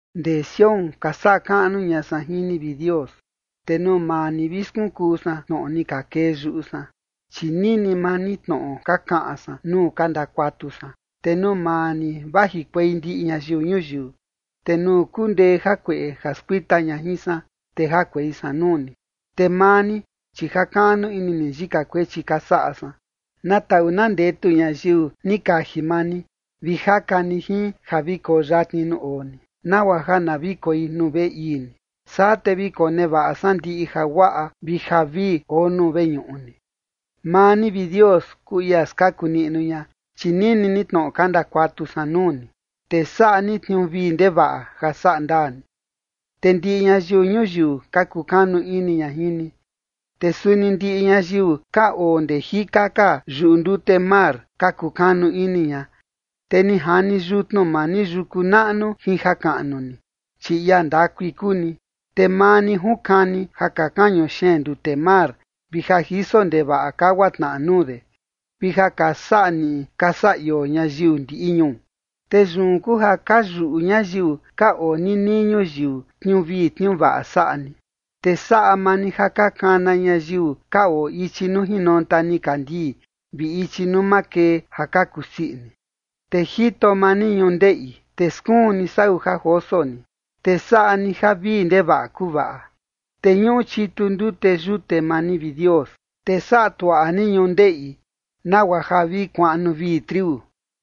Ndee Sión ka saꞌa kaꞌnu ña san jin ni, vi Dios, te nuu maa ni vi skunkuu san tnoꞌo ni ka kee yuꞌu san. Chi nini maa ni tnoꞌo ka kaꞌan san nuu ka ndakuatu san, te nuu maa ni vajikuei ndiꞌi ñayiu ñuyiu. Te nuu kundee jakueꞌe ja skuita ña jin san, te jakuei san nuu ni, te maa ni, chi jakaꞌnu ini ni yika kuechi ka saꞌa san. Na taꞌu na ndetu ñayiu ni kaji maa ni vi jaka ni jin ja vi koo yatni nuu oo ni, nagua ja na vi koi nuu veꞌe ii ni. Saa te vi konevaꞌa san ndiꞌi jaguaꞌa vi javii oo nuu veñuꞌu ni. Maa ni, vi Dios, kuu ia skaku niꞌnu ña, chi nini ni tnoꞌo ka ndakuatu san nuu ni, te saꞌa ni tniuu vii ndevaꞌa ja saꞌa ndaa ni. Te ndiꞌi ñayiu ñuyiu ka kukanu ini ña jin ni, te suni ndiꞌi ñayiu ka oo ndee jika ka yuꞌu ndute mar ka kukanu ini ña. Te ni jani yutnu maa ni yuku naꞌnu jin jakaꞌnu ni, chi ia ndakui kuu ni. Te maa ni junkani ja ka kañu xeen ndute mar vi ja jiso ndevaꞌa kagua tnaꞌa nuu de, vi ja ka saꞌa niꞌi ka saꞌa ioo ñayiu ndiꞌi ñuu. Te yun kuu ja ka yuꞌu ñayiu ka oo ninii ñuyiu tniuu vii tniuu vaꞌa saꞌa ni, te saꞌa maa ni ja ka kana ñayiu ka oo ichi nuu jinonta nikandii vi ichi nuu makee ja ka kusii ini. Te jito maa ni ñundeꞌi, te skuun ni sau ja joso ni, te saꞌa ni ja vii ndevaꞌa kuvaꞌa. Te ñuꞌu chitu ndute yute maa ni, vi Dios, te saꞌa tuaꞌa ni ñundeꞌi, nagua ja vi kuaꞌnu vii triu.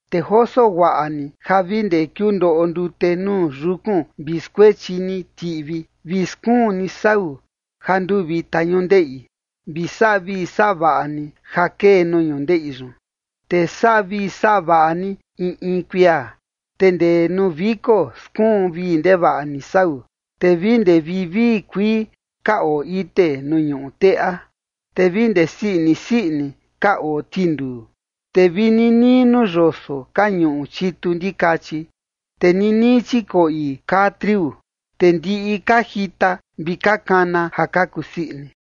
Te joso guaꞌa ni ja vi ndee kiundoꞌo ndute nuu yukun vi skuechi ni tiꞌvi, vi skuun ni sau ja nduu vita ñundeꞌi, vi saꞌa vii saꞌa vaꞌa ni ja kee nuu ñundeꞌi yun. Te saꞌa vii saꞌa vaꞌa ni in in kuia, te ndee nuu viko, skuun vii ndevaꞌa ni sau. Te vi ndee vivii kuii ka oo ite nuu ñuꞌu teꞌa, te vi ndee sii ini sii ini ka oo tinduu. Te vi ninii nuu yoso ka ñuꞌu chitu ndikachi, te ninii chikoꞌi kaa triu, te ndiꞌi ka jita vi ka kana ja ka kusii ini.